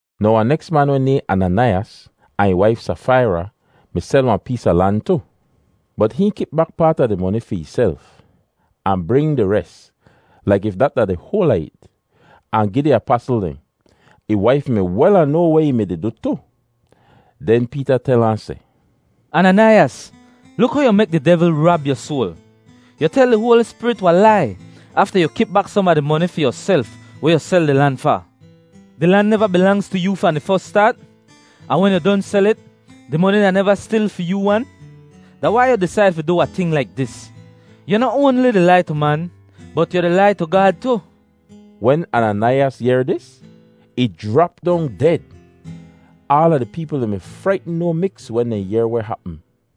Now wahn neks man weh nayhn Ananaiyas, ahn ih waif Safaira, mi sel wahn pees a lan tu. Bot hihn kip bak paat a di moni fi ihself, ahn bring di res, laik if dat da di hoal a it, ahn gi di apasl dehn. Ih waif mi wel ahn noa weh ih mi-di du tu. Den Peeta tel ahn seh, “Ananaiyas, luk how yu mek di devl rab yu soal! Yu tel di Hoali Spirit wahn lai afta yu kip bak som a di moni fi yuself weh yu sel di lan fa. Di lan neva bilangz tu yoo fahn di fos staat? Ahn wen yu don sel it, di moni da neva stil fi yoo wan? Da wai yu disaid fi du wahn ting laik dis? Yu noh oanli di lai tu man bot yu di lai tu Gaad tu!” Wen Ananaiyas yehr dis, ih jrap dong ded! Aala di peepl dehn mi fraitn no miks wen dehn yehr weh hapm.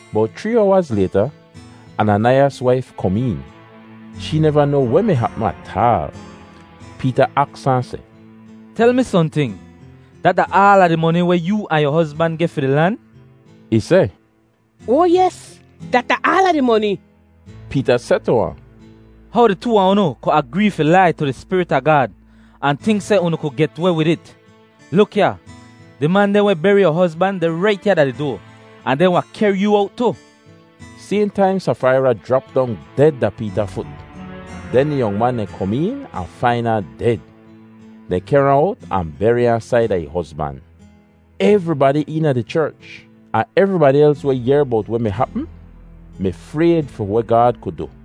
Bowt chree owaz layta, Ananaiyas waif kom een. Shee neva noa weh mi hapm ataal. Peeta aks ahn seh, “Tel mi sohnting, dat da aala di moni weh yoo ahn yu hozban geh fi di lan?” Ih seh, “Oa yes, dat da aala di moni!” Peeta seh tu ahn, “How di too a unu ku agree fi lai tu di Spirit a Gaad ahn tink seh unu ku get weh wid it? Luk ya! Di man dehn weh beri yu hozban deh rait ya da di doa, ahn dehn wahn kehr yoo owt tu!” Sayhn taim Safaira jrap dong ded da Peeta fut! Den di yong man dehn kom een ahn fain ahn ded. Dehn kehr ahn owt ahn beri ahn saida ih hozban. Evribadi eena di cherch, ahn evribadi els weh yehr bowt weh mi hapm, mi frayd fi weh Gaad ku du.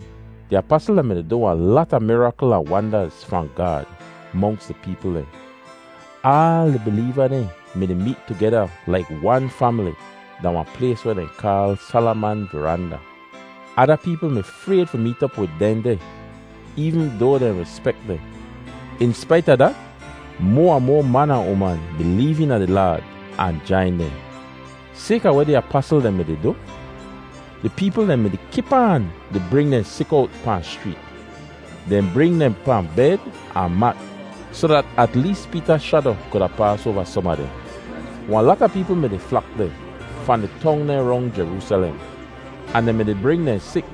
Di apasl dehn mi-di du wahn lata mirakl ahn wandaz fahn Gaad monks di peepl dehn. Aal di bileeva dehn mi-di meet tugeda laik wan famili da wahn plays weh dehn kaal Salaman Varanda. Ada peepl mi frayd fi meet op wid dehn deh, eevn doa dehn rispek dehn. In spait a dat, moa ahn moa man ahn uman bileev eena di Laad ahn jain dehn. Sayka weh di apasl dehn mi-di du, di peepl dehn mi-di kip aan di bring dehn sik owt pahn schreet. Dehn bring dehn pahn bed ahn mat soh dat at lees Peeta shado kuda paas oava som a dehn. Wahn lata peepl mi-di flak deh fahn di tong dehn rong Jeroosalem. Ahn dehn mi-di bring dehn sik,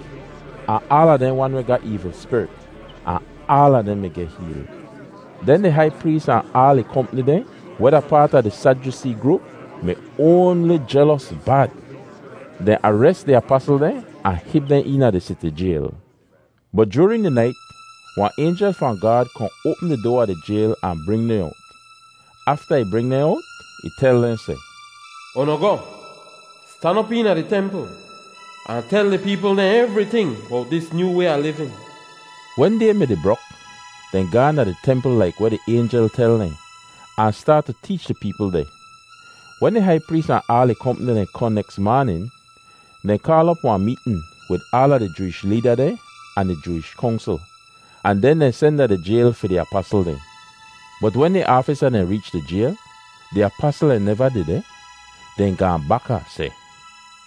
ahn aala dehn wan weh ga eevl spirit, ahn aala dehn mi geh heel. Den di hai prees ahn aal ih kompni dehn, weh da paat a di Sadyusee groop, mi oanli jelos bad. Dehn ares di apasl dehn ahn hib dehn eena di siti jayl. Bot joorin di nait wahn aynjel fahn Gaad kohn oapm di doa a di jayl ahn bring dehn owt. Afta ih bring dehn owt, ih tel dehn seh, “Unu goh, stan op eena di templ ahn tel di peepl dehn evriting bowt dis nyoo way a livin.” Wen day mi-di brok, dehn gaahn da di templ laik weh di aynjel tel dehn, ahn staat tu teech di peepl deh. Wen di hai prees ahn aal ih kompni dehn kohn neks maanin, dehn kaal op wahn meetn wid aala di Jooish leeda dehn ahn di Jooish Kongsl, ahn den dehn sen da di jayl fi di apasl dehn. Bot wen di aafisa dehn reech da di jayl, di apasl dehn neva dehdeh! Dehn gaahn bak ahn seh,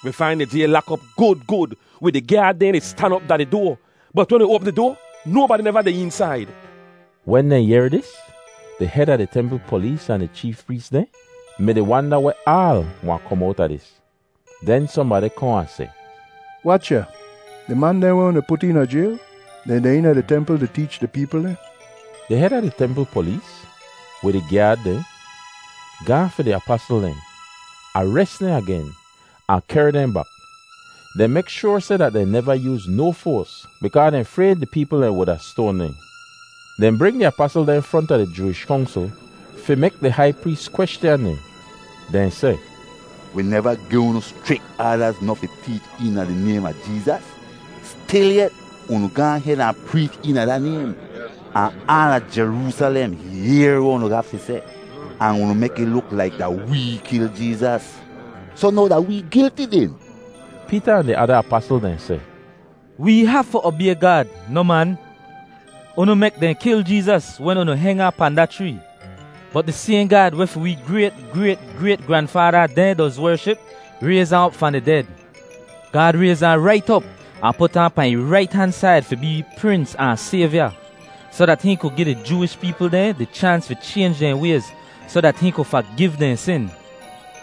“Wi fain di jayl lak op gud gud, wid di gyaad dehn di stan op da di doa, bot wen wi oapm di doa, nobadi neva deh eensaid!” Wen dehn yehr dis, di hed a di templ polees ahn di cheef prees dehn mi-di wanda weh aal wahn kom owta dis! Den sohnbadi kohn ahn seh, “Wach ya! Di man dehn weh unu put eena jayl, dehn deh eena di templ di teech di peepl dehn.” Di hed a di templ polees, wid ih gyaad dehn, gaahn fi di apasl dehn, ares dehn agen, ahn kehr dehn bak. Dehn mek shoar seh dat dehn neva yooz no foas bikaa dehn frayd di peepl dehn wuda stoan dehn. Dehn bring di apasl dehn fronta di Jooish Kongsl fi mek di hai prees kweschan dehn. Dehn seh, “Wi neva gi unu schrik aadaz noh fi teech eena di naym a Jeezas? Stilyet, unu gaahn hed ahn preech eena da naym, ahn aala Jeroosalem yehr weh unu ga fi seh, ahn unu mek ih luk laik da wee kil Jeezas. Soh now da wee gilti den?” Peeta ahn di ada apasl dehn seh, “Wee hafu obay Gaad, noh man. Unu mek dehn kil Jeezas wen unu heng ahn pahn da chree, bot di sayhn Gaad weh fi wee grayt-grayt-grayt-granfaada dehn doz wership rayz ahn op fahn di ded. Gaad rayz ahn rait op ahn put ahn pahn ih rait han said fi bee Prins ahn Sayvya, soh dat hihn ku gi di Jooish peepl dehn di chaans fi chaynj dehn wayz soh dat hihn ku fagiv dehn sin.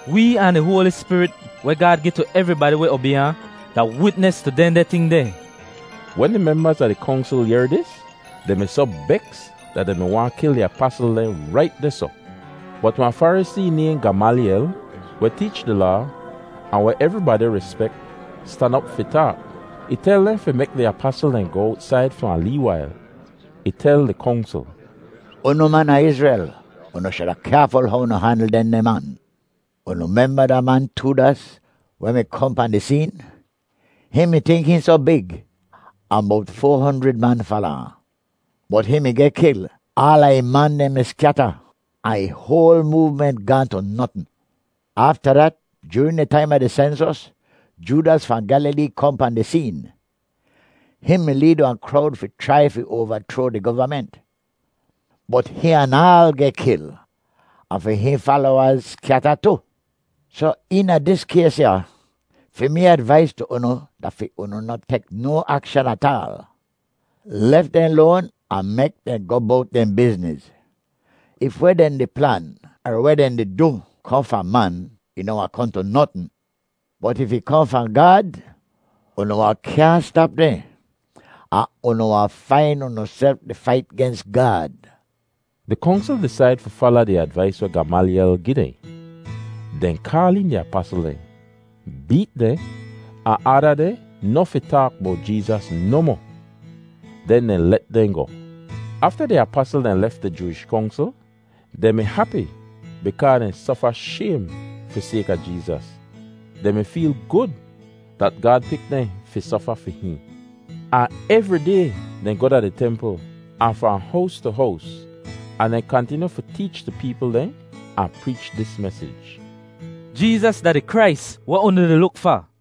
Wee ahn di Hoali Spirit, weh Gaad gi tu evribadi weh obay ahn, da witnis tu dehndeh ting dehn.” Wen di membaz a di Kongsl yehr dis, dehn mi soh beks dat dehn mi waahn kil di apasl dehn rait dehsoh. Bot wahn Farisee nayhn Gamalyel weh teech di Laa, ahn weh evribadi rispek, stan op fi taak. Ih tel dehn fi mek di apasl dehn goh owtsaid fi wahn lee wail. Ih tel di Kongsl, “Unu man a Izrel, unu shuda kyaaful how unu handl dehndeh man. Unu memba da man Toodas weh mi kohn pahn di seen? Hihn mi tink hihn soh big, ahn bowt foa honjrid man fala ahn. Bot hihn mi geh kil, aala ih man dehn mi skyata, ahn ih hoal moovment gaahn tu notn. Afta dat, joorin di taim a di sensos, Joodas fahn Gyalilee kohn pahn di seen. Hihn mi leed wahn krowd fi chrai fi oavachroa di govament. Bot hihn anaal geh kil, ahn fi hihn falowaz skyata tu. Soh eena dis kays ya, fi mee advais tu unu da fi unu noh tek no akshan ataal. Lef dehn loan, ahn mek dehn goh bowt dehn bizniz. If weh dehn di plan er weh dehn di du kohn fahn man, ih noh wahn kohn tu notn. Bot if ih kohn fahn Gaad, unu wahn kyaahn stap dehn ahn unu wahn fain unuself di fait gens Gaad.” Di Kongsl disaid fi fala di advais weh Gamalyel gi dehn. Dehn kaal een di apasl dehn, beet dehn, ahn aada dehn noh fi taak bowt Jeezas nohmoh. Den dehn let dehn goh. Afta di apasl dehn lef di Jooish Kongsl, dehn mi hapi bikaa dehn sofa shaym fi sayka Jeezas. Dehn mi feel gud dat Gaad pik dehn fi sofa fi hihn. Ahn evri day dehn goh da di templ, ahn fahn hows tu hows, ahn dehn kantinyu fi teech di peepl dehn ahn preech dis mesij: “Jeezas da di Krais weh unu di luk fa!”